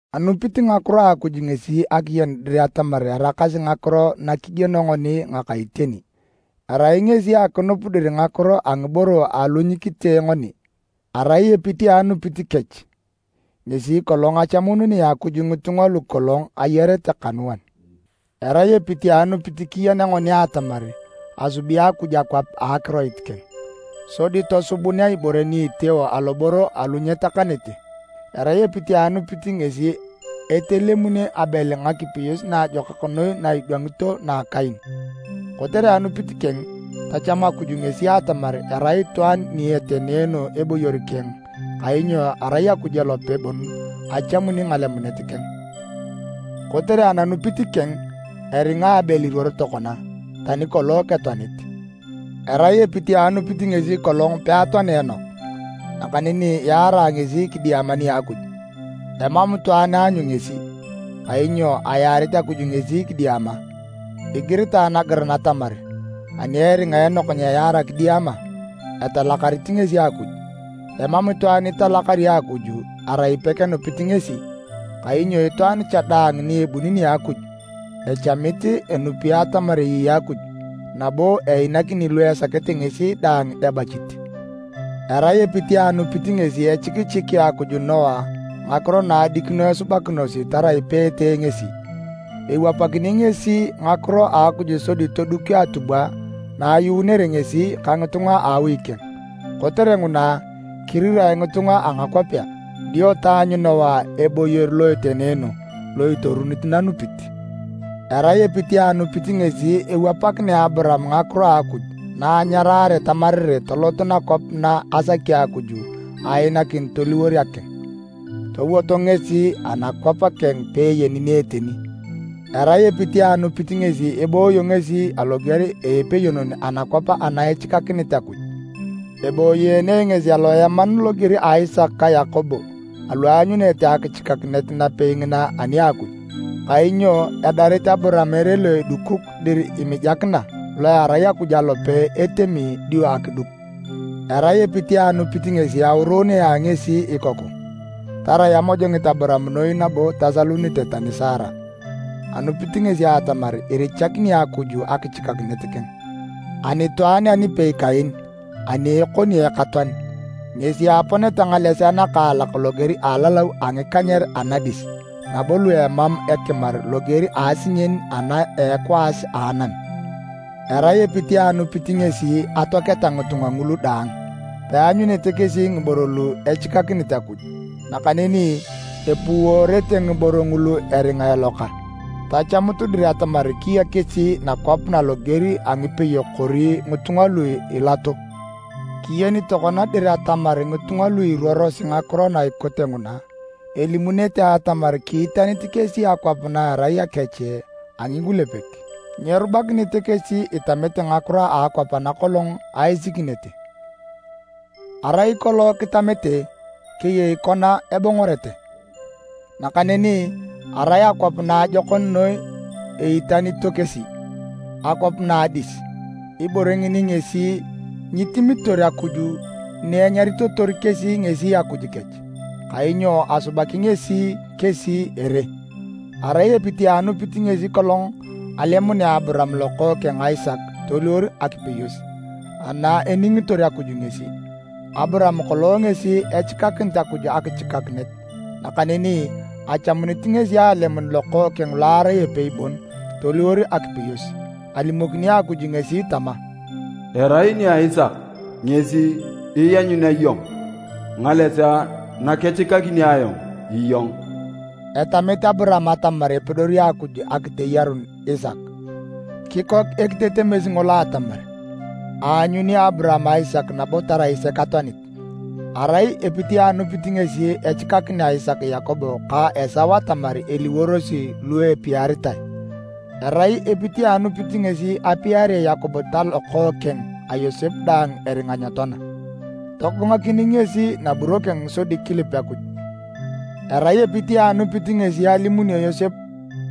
Anupit ngakiro a Akuj ngesi akiyen dir atamar eraakasi ngakiro na kigieno ngoni ngaka iteni, erai ngesi akinup dir ngakiro a ngiboro alu nyikitee ngoni. Erai epit a anupit kech ngesi kolong achamununea Akuj ngitunga lu kolong ayarete kanuan. Erai epit a anupit kiyenea ngoni atamar asubi Akuj akwap a akiroit keng. Sodi tosubunae ibore ni iteeo aloboro alu nyetakanete. Arai epit a anupit ngesi etelemuni Abel ngakipeyos naajokak noi na edwangito na Kain. Kotere anupit keng, tachamu Akuj ngesi atamar erai itwaan ni etenoono eboyor keng kainyo arai Akuj alope bon achamuni ngalemunet keng. Kotere ananupit keng, eringa Abel iruoro tokona, tani kolong ketoanit. Arai epit a anupit ngesi kolong peatoanea Enok. Nakaneni yaarae ngesi kidiama nia Akuj, emam itwaan aanyu ngesi, kainyo ayaarit Akuj ngesi kidiama. Igiritae nagiran atamar ani eringa Enok nyeyaara kidiama, etalakarit ngesi Akuj. Emam itwaan italakari Akuj erai pekenupit ngesi, kainyo itwaan cha daang ni ebuni nia Akuj, echamit enupi atamar eyei Akuj, nabo einakini lu esakete ngesi daang ebachit. Arai epit a anupit ngesi echikichikea Akuj Noa ngakiro na adikino esubakinosi tarai peetee ngesi. Ewapakini ngesi ngakiro a Akuj sodi toduk atubwa na ayuunere ngesi ka ngitunga a awi keng. Kotere nguna, kirirae ngitunga a ngakwapea, dio taanyu Noa eboyor lo etenoono lo itorunit nanupit. Arai epit a anupit ngesi ewapakinea Aburaam ngakiro a Akuj na anyaraare tamarae tolot nakwap na asaki Akuj ainakin toliwor akeng. Towot ngesi anakwap keng peeyeni ni eteni. Arai epit a anupit ngesi ebooyo ngesi loger a epeyonon anakwap ana echikakinit Akuj. Eboyeene ngesi aloeman loger a Isaka ka Yakobo alu aanyunete akichikakinet napei ngina ani a Akuj. Kainyo edarit Aburaam ere lo edukuk dir imijakina, lo erai Akuj alope etemi dio akiduk. Arai epit a anupit ngesi auriunea ngesi ikoku, tarai amojongit Aburaam noi nabo tasalunite tani Sara. Anupit ngesi atamar irichakini Akuj akichikakinet keng. Anitwaan anipei kaen, ani ekoni ekatoan, ngesi aponeta ngalesea nakaalak loger a alalau a ngikanyer anadis, nabo lu emam ekimar loger a asinyen ana a ekwaas a anam. Arai epit a anupit ngesi atoaketa ngitunga ngulu daang. Peanyunete kesi ngiboro lu echikakinit Akuj, nakaneni epouworete ngiboro ngulu eringa eloka, tachamut dir atamar kiya kesi nakwap na loger a ngipeyok kori ngitunga lu ilato. Kiyeni tokona dir atamar ngitunga lu iruorosi ngakiro na ikote nguna, elimunete atamar kiitanit kesi akwap na erai akech a ngikulepek. Nyerubakinete kesi itamete ngakiro a akwap ana kolong aisikinete. Arai kolong kitamete, keyei kona ebongorete. Nakaneni arai akwap naajokon noi eitanito kesi, akwap na a adis. Ibore ngini ngesi nyitimitor Akuj ni enyaritotor kesi ngesi Akuj kech, kainyo asubaki ngesi kesi ere. Arai epit a anupit ngesi kolong alemunea Aburaam lokookeng Isaka toliwor akipeyos, na eningitor Akuj ngesi. Aburaam kolong ngesi echikakinit Akuj akichikakinet, nakaneni achamunit ngesi alemun lokookeng lo arai epei bon toliwor akipeyos. Alimokini Akuj ngesi tama, “Erai nia Isaka ngesi ianyunea iyong ngalesea nakechikakini ayong iyong.” Etemit Aburaam atamar epedori Akuj akiteyarun Isaka, kikok ekitetemes ngolo atamar, aanyuni Aburaam Isaka nabo tarai sek atoanit. Arai epit a anupit ngesi echikakinea Isaka Yakobo ka Esau atamar eliworosi lu epiaritae. Arai epit a anupit ngesi apiarea Yakobo talokookeng a Yosep daang eringa nyetoana. Togongakin ngesi naburo keng sodi kilip Akuj. Arai epit a anupit ngesi alimunio Yosep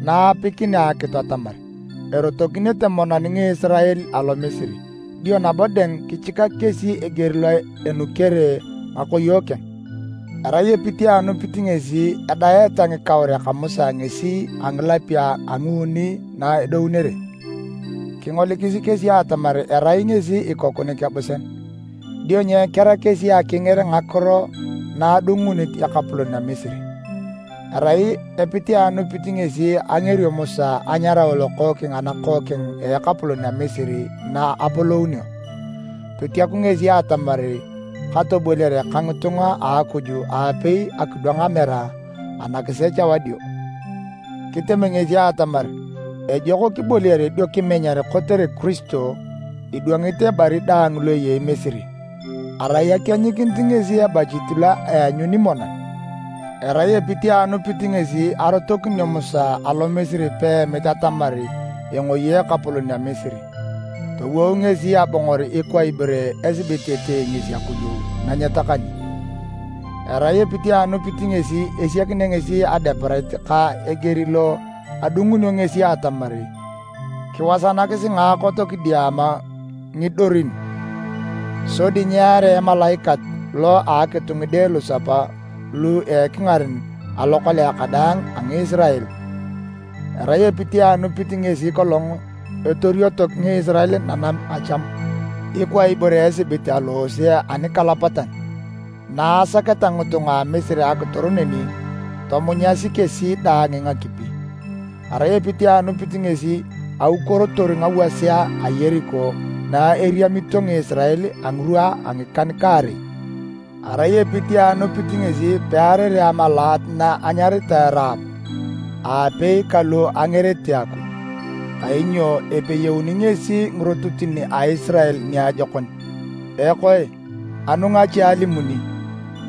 na aapikinea akitu atamar erotokinete monan Ngisirael alo Misiri, dio nabo dang kichikak kesi eger lo enukere ngakoyo keng. Arai epit a anupit ngesi edaeta ngikauriak a Musa ngesi a ngilapio a nguuni na edounere. Kingolikis kesi atamar erai ngesi ikoku nikebusean, dio nyekera kesi akinger ngakiro na adungunit ekapolon a Misiri. Arai epit a anupit ngesi angerio Musa anyarao lokookeng a nakookeng a ekapolon a Misiri na apolounio. Totiaku ngesi atamar katoboliare ka ngitunga a Akuj aapei akidwang amera anakisech wadio. Kitem ngesi atamar ejok kiboliare dio kimenyar kotere Kiristo idwangit ebari daang lo eyei Misiri. Arai akienyikinit ngesi ebachit lo eanyuni monan. Arai epit a anupit ngesi arotokinio Musa alo Misiri peemit atamar engoi ekapolon a Misiri. Towou ngesi abongor ikwa ibore esibit etee ngesi Akuj na nyetakani. Arai epit a anupit ngesi esiakinea ngesi Adeparet ka eger lo adungunio ngesi atamar kiwasanakisi ngaakot kidiama ngidorin, sodi nyearea Emalaikat lo a akitu ngide lusapa lu ekingaren alokolea kadaang a Ngisirael. Arai epit a anupit ngesi kolong etorioto Ngisirael Nanam a Chamu, ikwa ibore esibit aloose anikalapatan. Na asaketa ngitunga a Misiri akitor neni, tomunyasi kesi daang ngakipi. Arai epit a anupit ngesi aukuorotor ngawasea a Yeriko na erimioto Ngisirael a ngirwa a ngikan-kaarei. Arai epit a anupit ngesi pearere amalaat na enyaritae Raab aapei ka lu angerete Akuj, kainyo epeyeuni ngesi ngirototin a Isirael niajokon. Ekoe, anu ngache alimuni?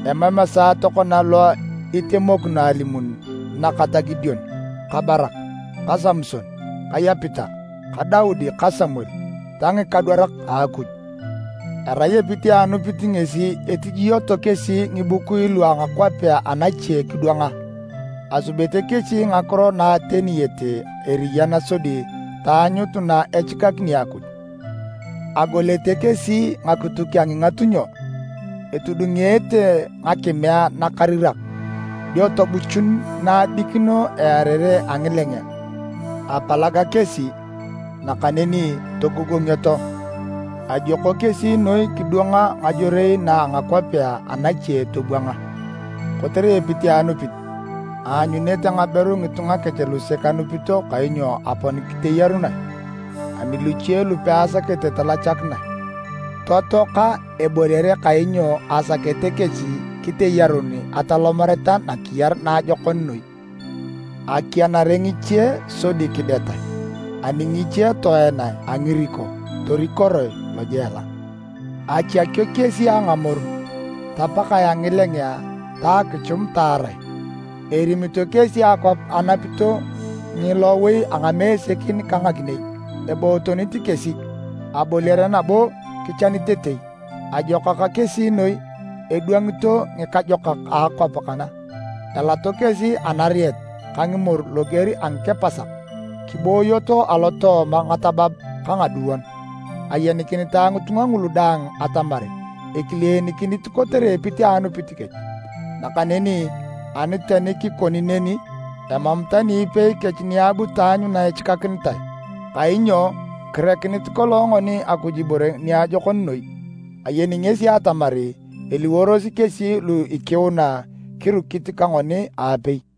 Emam esaa tokona lo itemokino alimuni na kata Gideon ka Barak, ka Samson ka Yepita, ka Daudi ka Samuel ta ngikadwarak a Akuj. Arai epit a anupit ngesi etijioto kesi ngibukui lu a ngakwapea anache kidwanga. Asubete kesi ngakiro na ateniyete eriyan sodi taanyut na echikakini Akuj. Agolete kesi ngakituk a ngingatunyo, etudungeete ngakimea nakarirak, dio tobuchun na adikino earere a ngilengea. Apalag kesi, nakaneni togogongioto. Ajioko kesi noi kidwanga ngajorei na a ngakwapea anache tobwanga. Kotere epit a anupit, aanyunete ngaberu ngitunga kech lusek anupito kainyo apon kiteyerunae. Ani luche lu peasakete talachakinae, totoaka eboliare kainyo asakete kesi kiteyarun atolomareta nakiyar naajokon noi. Akianare ngiche sodi kidetae, ani ngiche toenae a ngiriko torikoroe lojela. Achakio kesi a ngamoru, tapakae a ngilengea ta akichum taarae! Erimito kesi akwap enapito ngilowi a ngamesekin ka ngakinei, ebootonit kesi, aboliare nabo kichanitetei. Ajokak kesi noi edwangito ngikajokak a akwap kana! Elato kesi anarieta ka ngimoru loger a ngikepasak, kiboyoto alotooma ngatabab ka ngaduon. Ayenikinitae ngitunga ngulu daang atamar ekilenikinit kotere epit a anupit kech! Nakaneni ani tani kikoni neni, emam tani ipei kech ni abu taanyu na echikakinitae, kainyo kirekinit kolong ngoni Akuj ibore niajokon noi. Ayeni ngesi atamar eliworosi kesi lu ikiuna kirukit ka ngoni aapei.